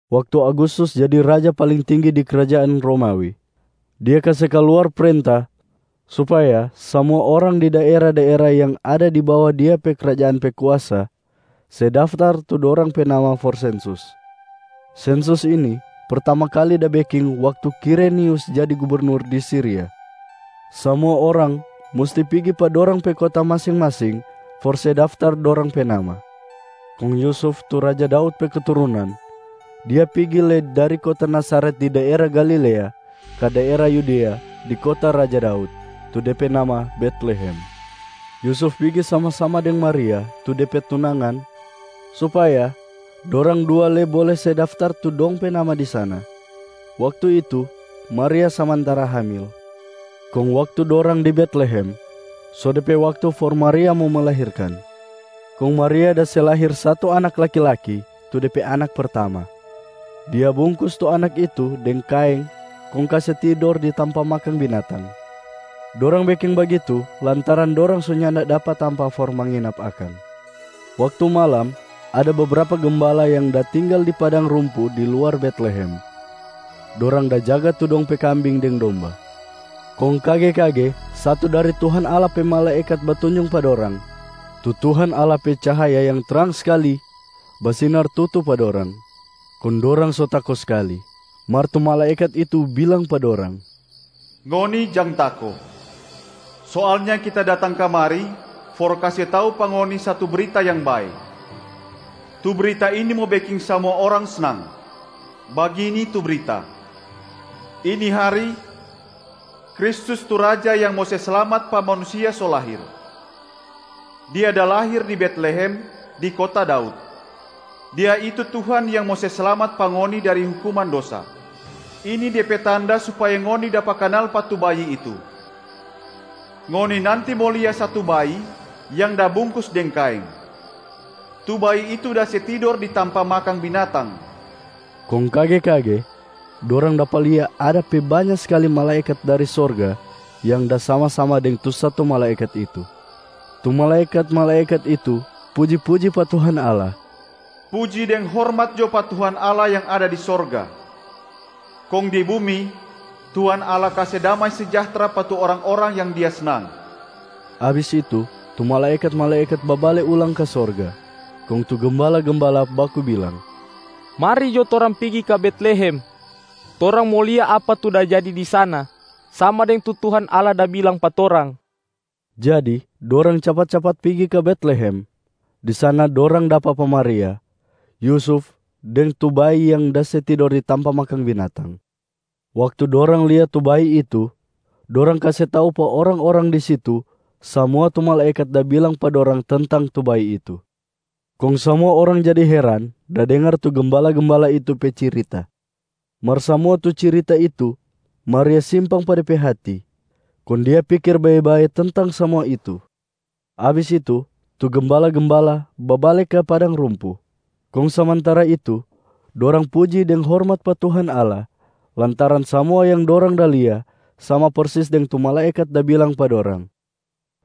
Waktu Agustus jadi raja paling tinggi di krajaan Romawi, dia kase kaluar prenta supaya samua orang di daera-daera yang ada di bawa dia pe krajaan pe kuasa, se daftar tu dorang pe nama for sensus. Sensus ini, pertama kali da beking waktu Kirenius jadi gubernur di Siria. Samua orang musti pigi pa dorang pe kota masing-masing for se daftar dorang pe nama. Kong Yusuf tu raja Daud pe keturunan, dia pigi lei dari kota Nazaret di daera Galilea ka daera Yudea di kota raja Daud, tu de pe nama Betlehem. Yusuf pigi sama-sama deng Maria tu de pe tunangan supaya dorang dua lei bole se daftar tu dong pe nama di sana. Waktu itu, Maria samantara hamil. Kong waktu dorang di Betlehem, so de pe waktu for Maria mo melahirkan. Kong Maria da se lahir satu anak laki-laki, tu de pe anak pertama. Dia bungkus tu anak itu deng kaeng kong kase tidor di tampa makang binatang. Dorang beking bagitu lantaran dorang so nyanda dapa tampa for manginap akang. Waktu malam, ada bebrapa gembala yang da tinggal di padang rumpu di luar Betlehem, dorang da jaga tu dong pe kambing deng domba. Kong kage-kage satu dari Tuhan Allah pe malaekat batunjung pa dorang. Tu Tuhan Allah pe cahaya yang trang skali basinar tutu pa dorang, kong dorang so tako skali. Mar tu malaekat itu bilang pa dorang, “Ngoni jang tako! Soalnya kita datang kamari for kase tau pa ngoni satu brita yang bae. Tu brita ini mo beking samua orang snang. Bagini tu brita: ini hari, Kristus tu Raja yang mo se slamat pa manusia so lahir. Dia da lahir di Betlehem, di kota Daud. Dia itu Tuhan yang mo se slamat pa ngoni dari hukuman dosa. Ini de pe tanda supaya ngoni dapa kanal pa tu bayi itu: ngoni nanti mo lia satu bayi yang da bungkus deng kaeng. Tu bayi itu da se tidor di tampa makang binatang.” Kong kage-kage dorang dapa lia ada pe banya skali malaekat dari sorga yang da sama-sama deng tu satu malaekat itu. Tu malaekat-malaekat itu puji-puji pa Tuhan Allah, “Puji deng hormat jo pa Tuhan Allah yang ada di sorga! Kong di bumi, Tuhan Allah kase damai sejahtra pa tu orang-orang yang Dia snang.” Abis itu, tu malaekat-malaekat babale ulang ka sorga. Kong tu gembala-gembala baku bilang, “Mari jo torang pigi ka Betlehem. Torang mo lia apa tu da jadi di sana, sama deng tu Tuhan Allah da bilang pa torang.” Jadi dorang capat-capat pigi ka Betlehem. Di sana dorang dapa pa Maria, Yusuf deng tu bayi yang da se tidor di tampa makang binatang. Waktu dorang lia tu bayi itu, dorang kase tau pa orang-orang di situ samua tu malaekat da bilang pa dorang tentang tu bayi itu. Kong samua orang jadi heran da dengar tu gembala-gembala itu pe cirita. Mar samua tu cirita itu Maria simpang pa de pe hati, kong dia pikir bae-bae tentang samua itu. Abis itu, tu gembala-gembala babale ka padang rumpu. Kong samantara itu, dorang puji deng hormat pa Tuhan Allah lantaran samua yang dorang da lia sama persis deng tu malaekat da bilang pa dorang.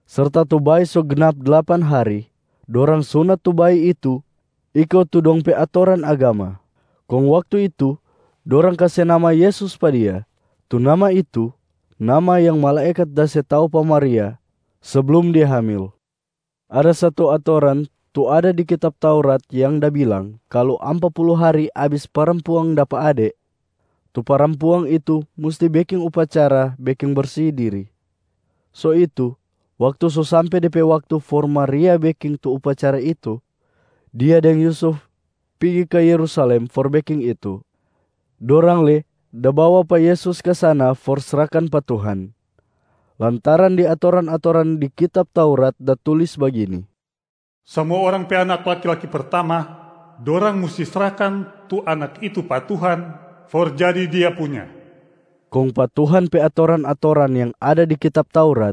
Serta tu bayi so gnap dlapan hari, dorang sunat tu bayi itu iko tu dong pe atoran agama. Kong waktu itu, dorang kase nama Yesus pa Dia. Tu nama itu, nama yang malaekat da se tau pa Maria seblum dia hamil. Ada satu atoran tu ada di kitab Taurat yang da bilang kalu ampa pulu hari abis parampuang dapa ade, tu parampuang itu musti beking upacara beking bersi diri. So itu, waktu so sampe de pe waktu for Maria beking tu upacara itu, dia deng Yusuf pigi ka Yerusalem for beking itu. Dorang lei da bawa pa Yesus ka sana for srahkan pa Tuhan, lantaran di atoran-atoran di kitab Taurat da tulis bagini, “Samua orang pe anak laki-laki pertama, dorang musti srahkan tu anak itu pa Tuhan for jadi Dia punya.” Kong pa Tuhan pe atoran-atoran yang ada di kitab Taurat,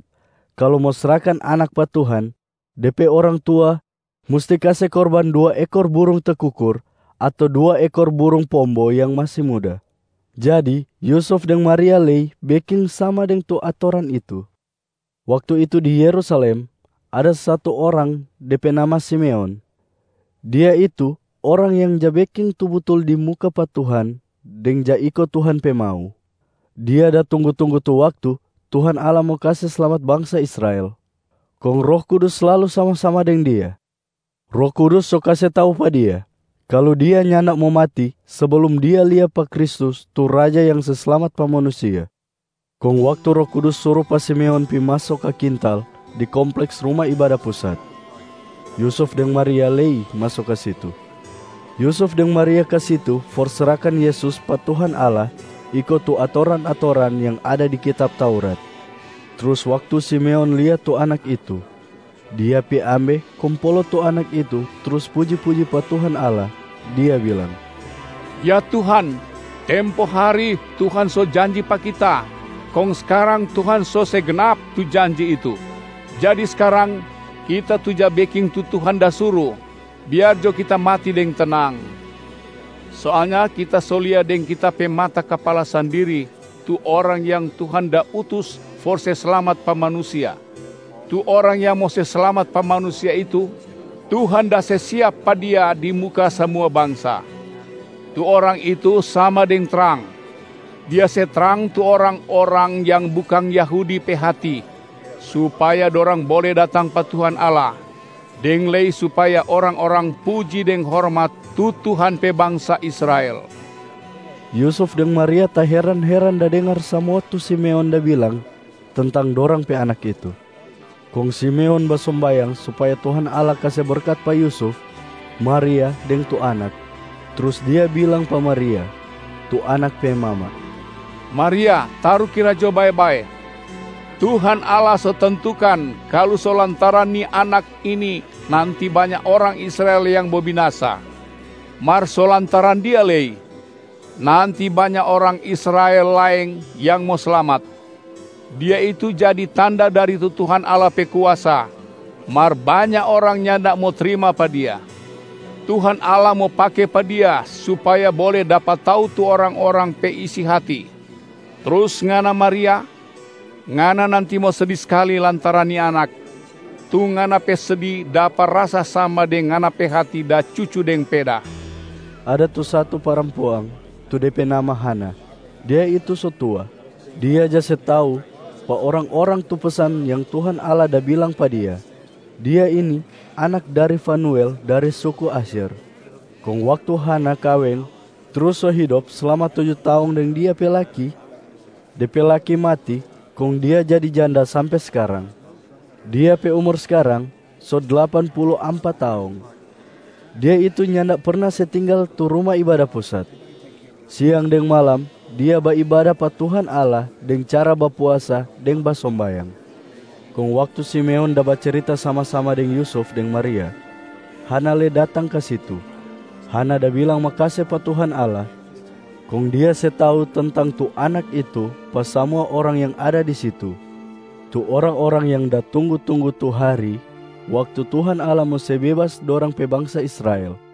kalu mo srahkan anak pa Tuhan, de pe orang tua musti kase korban dua ekor burung tekukur ato dua ekor burung pombo yang masi muda. Jadi Yusuf deng Maria lei beking sama deng tu atoran itu. Waktu itu di Yerusalem, ada satu orang de pe nama Simeon. Dia itu orang yang ja beking tu butul di muka pa Tuhan deng ja iko Tuhan pe mau. Dia da tunggu-tunggu tu waktu Tuhan Allah mo kase slamat bangsa Israel. Kong Roh Kudus slalu sama-sama deng dia. Roh Kudus so kase tau pa dia, kalu dia nyanda mo mati seblum dia lia pa Kristus tu Raja yang se slamat pa manusia. Kong waktu Roh Kudus suru pa Simeon pi maso ka kintal di kompleks Ruma Ibada Pusat, Yusuf deng Maria lei maso ka situ. Yusuf deng Maria ka situ for srahkan Yesus pa Tuhan Allah iko tu atoran-atoran yang ada di kitab Taurat. Trus waktu Simeon lia tu Anak itu, dia pi ambe kong polo tu Anak itu trus puji-puji pa Tuhan Allah, dia bilang, “Ya Tuhan, tempo hari Tuhan so janji pa kita, kong skarang Tuhan so se gnap tu janji itu. Jadi skarang, kita tu ja beking tu Tuhan da suru, biar jo kita mati deng tenang. Soalnya kita so lia deng kita pe mata kapala sandiri tu Orang yang Tuhan da utus for se slamat pa manusia. Tu Orang yang mo se slamat pa manusia itu, Tuhan da se siap pa Dia di muka samua bangsa. Tu Orang itu sama deng trang, Dia se trang tu orang-orang yang bukang Yahudi pe hati supaya dorang bole datang pa Tuhan Allah, deng lei supaya orang-orang puji deng hormat tu Tuhan pe bangsa Israel.” Yusuf deng Maria taheran-heran da dengar samua tu Simeon da bilang tentang dorang pe Anak itu. Kong Simeon basombayang supaya Tuhan Allah kase berkat pa Yusuf, Maria deng tu Anak. Trus dia bilang pa Maria, tu Anak pe mama, “Maria, tarukira jo bae-bae, Tuhan Allah so tentukan kalu so lantaran ni Anak ini nanti banya orang Israel yang mo binasa, mar so lantaran Dia lei nanti banya orang Israel laeng yang mo slamat. Dia itu jadi tanda dari tu Tuhan Allah pe kuasa, mar banya orang nyanda mo trima pa Dia. Tuhan Allah mo pake pa Dia supaya bole dapa tau tu orang-orang pe isi hati. Trus ngana Maria, ngana nanti mo sedi skali lantaran ni Anak, tu ngana pe sedi dapa rasa sama deng ngana pe hati da cucu deng peda.” Ada tu satu parampuang tu de pe nama Hana. Dia itu so tua. Dia ja se tau pa orang-orang tu pesan yang Tuhan Allah da bilang pa dia. Dia ini anak dari Fanuel dari suku Asyer. Kong waktu Hana kaweng trus so hidop slama tuju taong deng dia pe laki, de pe laki mati kong dia jadi janda sampe skarang. Dia pe umur skarang so dlapan pulu ampa taong. Dia itu nyanda perna se tinggal tu Ruma Ibada Pusat. Siang deng malam dia baibada pa Tuhan Allah deng cara bapuasa deng basombayang. Kong waktu Simeon da bacirita sama-sama deng Yusuf deng Maria, Hana lei datang ka situ. Hana da bilang makase pa Tuhan Allah kong dia se tau tentang tu Anak itu pa samua orang yang ada di situ, tu orang-orang yang da tunggu-tunggu tu hari waktu Tuhan Allah mo se bebas dorang pe bangsa Israel.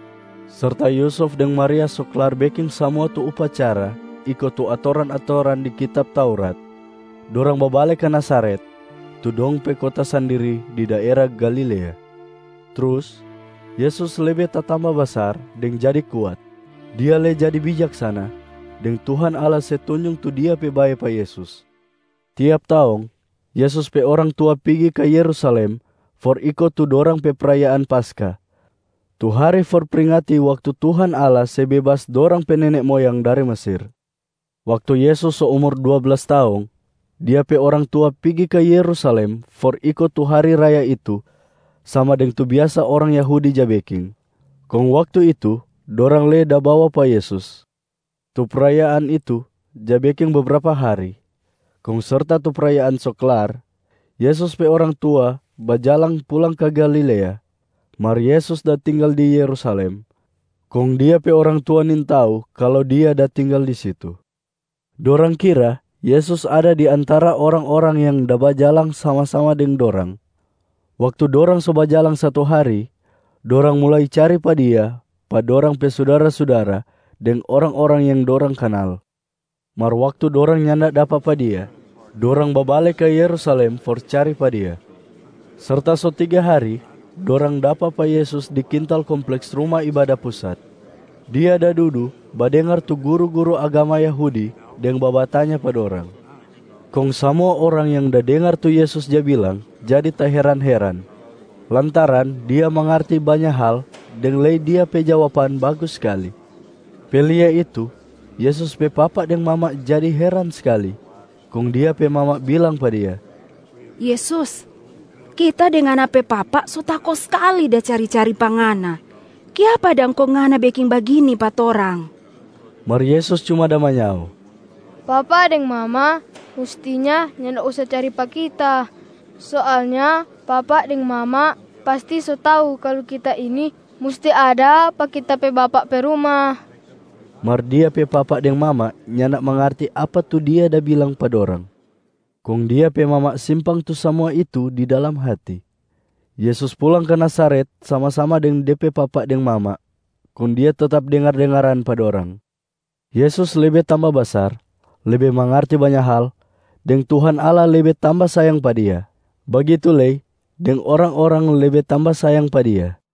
Serta Yusuf deng Maria so klar beking samua tu upacara iko tu atoran-atoran di kitab Taurat, dorang babale ka Nazaret, tu dong pe kota sandiri di daera Galilea. Trus Yesus lebe tatamba basar deng jadi kuat. Dia lei jadi bijaksana, deng Tuhan Allah se tunjung tu Dia pe bae pa Yesus. Tiap taong, Yesus pe orang tua pigi ka Yerusalem for iko tu dorang pe prayaan Paskah tu hari for pringati waktu Tuhan Allah se bebas dorang pe nene moyang dari Mesir. Waktu Yesus so umur dua blas taong, Dia pe orang tua pigi ka Yerusalem for iko tu hari raya itu sama deng tu biasa orang Yahudi ja beking. Kong waktu itu, dorang lei da bawa pa Yesus. Tu prayaan itu ja beking bebrapa hari. Kong serta tu prayaan so klar, Yesus pe orang tua bajalang pulang ka Galilea, mar Yesus da tinggal di Yerusalem kong Dia pe orang tua nintau kalu Dia da tinggal di situ. Dorang kira Yesus ada di antara orang-orang yang da bajalang sama-sama deng dorang. Waktu dorang so bajalang satu hari, dorang mulai cari pa Dia pa dorang pe sudara-sudara deng orang-orang yang dorang kanal. Mar waktu dorang nyanda dapa pa Dia, dorang babale ka Yerusalem for cari pa Dia. Serta so tiga hari, dorang dapa pa Yesus di kintal kompleks Ruma Ibada Pusat. Dia da dudu badengar tu guru-guru agama Yahudi deng babatanya pa dorang. Kong samua orang yang da dengar tu Yesus ja bilang jadi taheran-heran, lantaran Dia mangarti banya hal deng lei Dia pe jawaban bagus skali. Pe lia itu, Yesus pe papa deng mama jadi heran skali. Kong Dia pe mama bilang pa Dia, “Yesus, kita deng Ngana pe papa so tako skali da cari-cari pa Ngana. Kiapa dang kong Ngana beking bagini pa torang?” Mar Yesus cuma da manyao, “Papa deng mama mustinya nyanda usa cari pa Kita. Soalnya papa deng mama pasti so tau kalu Kita ini musti ada pa Kita pe Bapa pe ruma.” Mar Dia pe papa deng mama nyanda mangarti apa tu Dia da bilang pa dorang. Kong Dia pe mama simpang tu samua itu di dalam hati. Yesus pulang ka Nazaret sama-sama deng De pe papa deng mama, kong Dia tetap dengar-dengaran pa dorang. Yesus lebe tamba basar, lebe mangarti banya hal, deng Tuhan Allah lebe tamba sayang pa Dia, bagitu lei deng orang-orang lebe tamba sayang pa Dia.